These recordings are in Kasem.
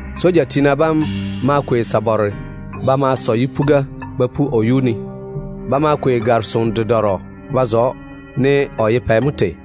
Soja tiina bam ma kwei sabare ba ma sɔ yipuga ba pu o yuu ne. Ba ma kwei gare-soŋo ba zo‑o ne o ye pɛ mo tei.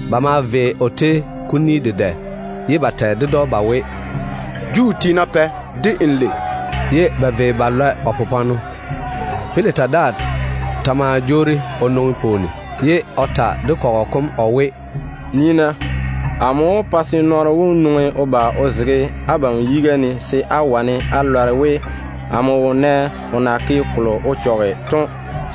Ba maa vei o tei kuni dedɛ, ye ba tɛ ded‑o ba we, “Juu tiina Pɛ, de n lei”. Ba maa jege o popwaano ba lɔe. Pilata daa ta ma jwoori o nwoŋi pwooni, ye o ta de kɔgɔ kom o we, “Nii-na, amo wó pa se nɔɔno wom nwoŋi o ba o zege abam yiga ne se á wane á lɔre we, amo wo nɛ o na ke kolo o chɔge to.”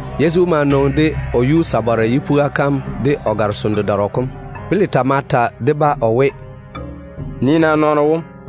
Yezu ma nwoŋi de o yuu sabare yipuga kam de o gare-soŋo kom. Pilata ma ta de-ba o we, “Nii-na nɔɔno wom da.”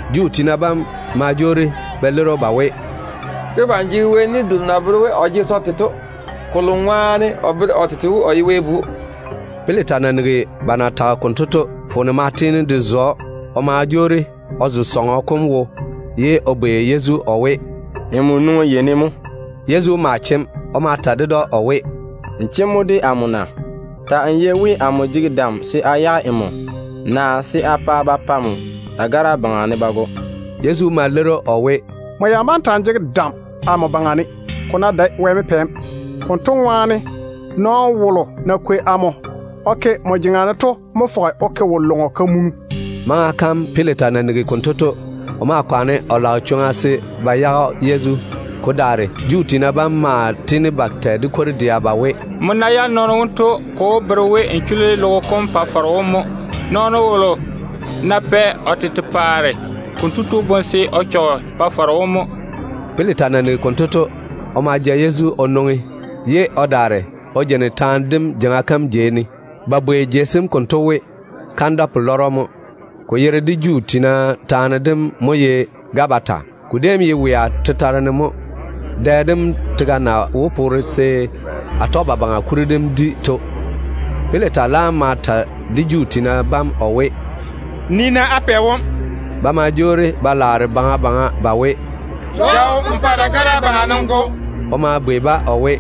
Juu tiina bam ma jwoori ba leiri‑o ba we, “Debam jege Wɛ ni delo na bere we o jege se o te to, kolo ŋwaane o bere o tete we o ye Wɛ Bu.” Pilata na nigi ba na tage konto to, foone ma tiini de zo‑o. O ma jwoori o zo sɔŋɔ kom wo, ye o bwei Yezu o we, “Nmo nwoŋi yei ne mo?” Yezu ma chem. O ma ta ded‑o o we, “Nmo chem mo de amo na? Ta‑n yei we amo jege dam se a yage nmo, naa se a pa ba pa nmo dagara yuu ne ba go.” Yezu ma leiri‑o o we, “Nmo ya bá ta‑n jege dam amo baŋa ne, ko ná dae Wɛ mo pɛ‑m. Konto ŋwaane, nɔɔno wolo na kwei amo o ke nmo jeŋa ne to mo tiini o ke wo-lɔŋɔ o dwoni nmo.” Maŋa kam Pilata na nigi konto to, o maa kwaane o lage chwoŋa se o pa ba yage Yezu. Ko daare Juu tiina bam maa tiini ba tɛ de kwor-dɛa ba we, “Nmo ná yage nɔɔno wonto, ko wó bere we n chuli logo kom Pa-faro wom mo. Nɔɔno wolo ná pɛ o tete paare, konto tu dwoni de Pa-faro wom mo.” Pilata na nigi konto to, o ma ja Yezu o nwoŋi, ye o daare o jeini taane dim jeiŋa kam jei ne. Ba bwoi jei sem konto we, ‘Kandwa-pelwaaro jeiga’ mo. Ko yere de Juu tiina taane dem mo ye ‘Gabata’. Ko déem ye wea tetare ne mo, dɛ dem tega na wó poore se Atɔgebabaŋa kuri dem di to. Pilata laam ma ta de Juu tiina bam o we, “Nii-na á pɛ wom da.” Ba ma jwoori ba laare baŋa baŋa ba we, “Ja‑o n pa dagara yuu ne n go!” O ma bwei-ba o we,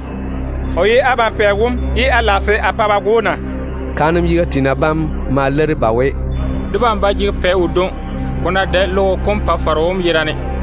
“O ye abam pɛ wom ye á lage se a pa ba go‑o na?” Kaanem yiga tiina bam ma leiri ba we, “Debam ba jege pɛ wodwoŋi, ko ná dae logo kom Pa-faro wom yerane.”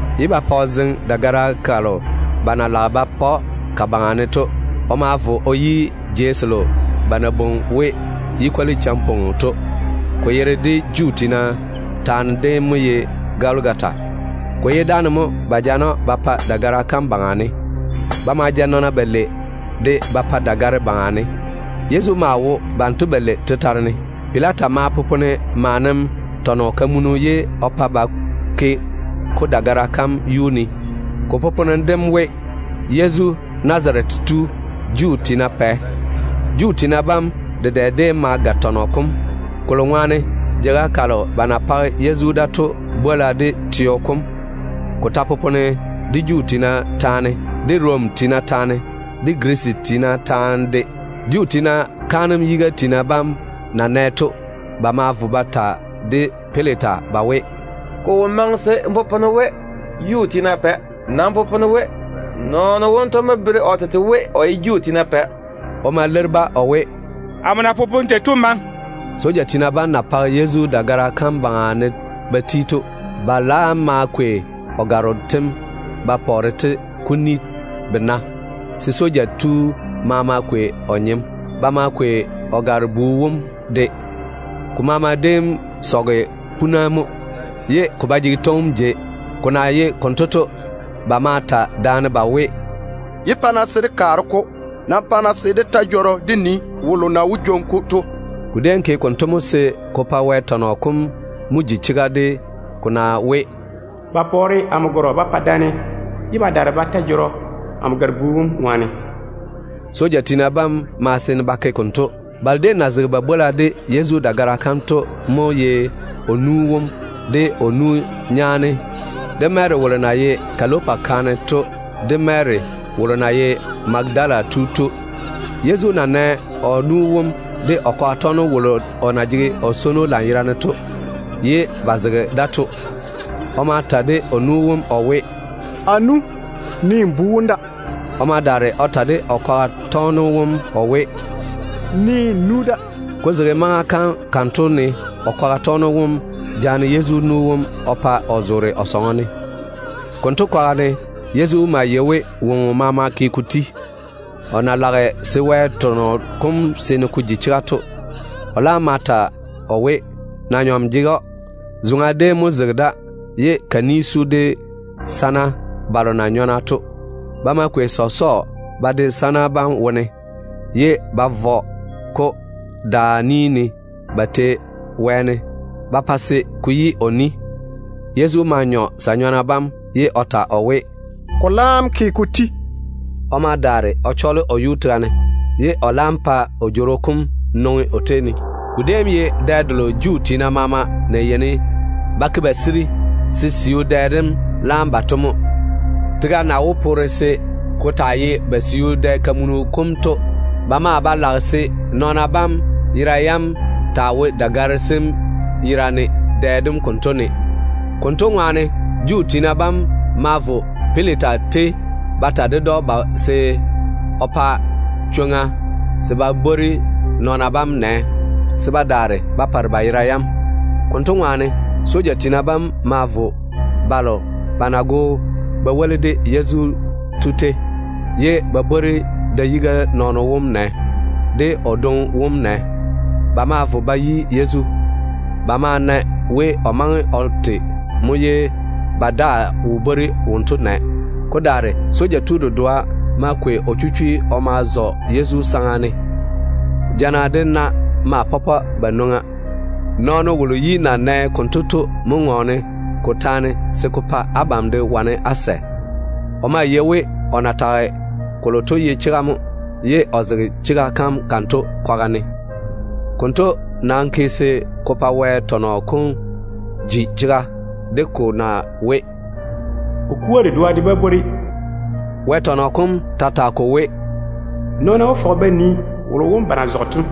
ye ba pa o zeŋe dagara kalo ba na lage ba pa‑o ka baŋa ne to. O ma vo o yi jeiga kalo ba na bwoi we, ‘Yu-kwoli-champoa Peo’ to. Ko yere de Juu tiina taane dem mo ye ‘Goligota’. Ko ye dáane mo ba jaane‑o ba pa dagara kam yuu ne. Ba ma ja nɔɔna balei de ba pa dagare baŋa ne. Yezu maa wo banto balei tetare ne. Pilata ma popone maanem tɔn-kamunu ye o pa ba tane-ko dagara kam yuu ne. Ko poponem dem we: YEZU, NAZARETE TU, JUU TIINA PƐ. Juu tiina bam dedɛ déem ma ga tɔnɔ kom, kolo ŋwaane jeiga kalo ba na page Yezu da to bwola de teo kom ni. Tɔnɔ kom déem popone de Juu tiina taane, de Rom tiina taane, de Girisi tiina taane mo. Juu tiina kaanem yiga tiina bam na nɛ to, ba ma vo ba ta de Pilata ba we, “Ko wo maŋe se n popone we, ‘Juu tiina Pɛ’. Nam popone we, ‘Nɔɔno wonto mo bere o tete we o ye Juu tiina Pɛ.’” O ma leiri-ba o we, “Amo na popone tei to daa ba kwana.” Soja tiina bam na page Yezu dagara kam yuu ne ba ti to, ba laam ma kwei o gwaaro tem ba pɔɔre-te kuni bena, se soja tu maama kwei o nyem. Ba ma kwei o gare-bu wom de. Ko maama déem sɔge puna mo, ko ba jege twoŋim jei. Ko na ye konto to, ba ma ta daane ba we, “Yé pa-na se dé kaare-ko. Nam pa-na dé ta jɔrɔ se dé nii wolo na wó jwoŋi-ko to.” Ko déem ke konto mo se ko pa kolo na popone Wɛ tɔnɔ kom wone to mo ji chega de ko na we, “Ba pɔɔre amo gwaaro ba pa daane, ye ba daare ba ta jɔrɔ amo gare-bu wom ŋwaane.” Soja tiina bam ma seene ba ke konto. Balo déem na zega ba bwola de Yezu dagara kam to mo ye o nu wom, de o nu nyaane, de Mary wolo na ye Kalopa kaane to, de Mary wolo na ye Magadala tu to. Yezu na nɛ o nu wom de o kwaga tɔgeno wolo o na jege o swono lanyerane, ye ba zege da to, o ma ta de o nu wom o we, “A nu, nii nmo bu wom da.” O ma daare o ta de o kwaga tɔgeno wom o we, “Nii n nu da.” Ko zege maŋa kam konto ne o kwaga tɔgeno wom jaane Yezu nu wom o pa o zoore o sɔŋɔ ne mo. Konto kwaga ne Yezu maa yei we woŋo maama ke ko ti. O na lage se Wɛ tɔnɔ kom seene ko ji chega to, o laam ma ta o we, na-nyɔm jege‑o. Zoŋa déem mo zege da, ye ka ni su de sana balo na nyɔna to. Ba ma kwei sɔsɔɔ ba de sa-nyɔna bam wone, ye ba vɔ-ko daa ni ne ba tei wɛɛne ba pa se ko yi o ni. Yezu ma nyɔ sa-nyɔna bam, ye o ta o we, “Ko laam ke ko ti.” O ma daare o chɔɔle o yuu tega ne, ye o laam pa o jworo kom nwoŋi o tei ne. Ko déem ye dɛ delo Juu tiina maama na yeini ba ti ba yiga se ba siu dɛ dem laam yi to mo. Tega na wó poore se ko taa ye ba siu dɛ-kamunu kom to, ba maa ba lage se nɔɔna bam yera yam taa wo dagare sem yera ne dɛ dem konto ne. Konto ŋwaane Juu tiina badwonna ma vo Pilata tei ba ta ded‑o se o pa chwoŋa se ba bwori nɔɔna bam nɛ se ba daare ba pare ba yera yam. Konto ŋwaane, soja tiina bam ma vo balo ba na go ba woli de Yezu to tei, ye ba bwori da-yiga nɔɔno wom nɛ, de o dwoŋi wom nɛ. Ba ma vo ba yi Yezu. Ba ma na we o maŋe o te mo ye ba daa wo bwori wonto nɛ. Ko daare soja tu dedoa ma kwei o chichwei o ma zɔ Yezu saŋa ne. Jana de na maa tae ba nwoŋa. Nɔɔno wolo yi na nɛ konto to mo ŋɔɔne ko taane se ko pa abam de wane á sɛ. O maa yei we o na tage kolo to ye chega mo, ye o zege chega kam konto kwaga ne. Konto nam ke se ko pa Wɛ tɔnɔ kom ji chega de ko na we, “O kua de dedoa de bá bwori.” Wɛ tɔnɔ kom ta tage ko we, “Nɔɔna wó fɔge ba nii wolo wom ba na zɔge to.”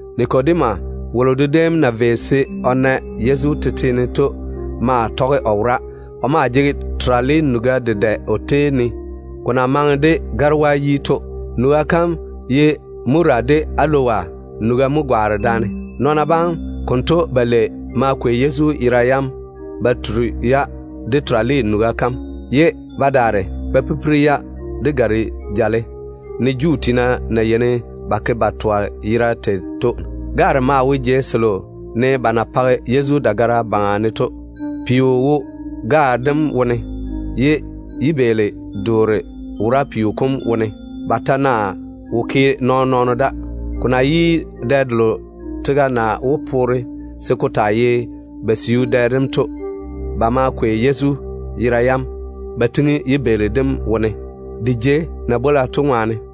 Nikodema wolo déem na vei o na Yezu tete ne to maa tɔge o wora. O maa jege terale nuga dedɛ o tei ne, ko na maŋe de garewaa yi. Nuga kam ye Mura de Alowa nuga mo gwaane daane. Nɔɔna bam konto balei ma kwei Yezu yera yam ba turi-ya de terale nuga kam, ye ba daare ba pipiri‑o de gare-jale, ne Juu tiina na yeini ba ke ba twa tei to. Gaare mo wo jei selo ne ba na page Yezu dagara yuu ne to. Peo maa wo gaare dem wone, ye yibeeli-doore wora peo kom yera ne, ba ta na wo ke nɔɔn-nɔɔno da. Ko na ye dɛ delo tega na wó poore se ko taa ye ba siu dɛ dem to, ba ma kwei Yezu yera yam ba tiŋi yibeeli dem wone, de jei na bwola to ŋwaane.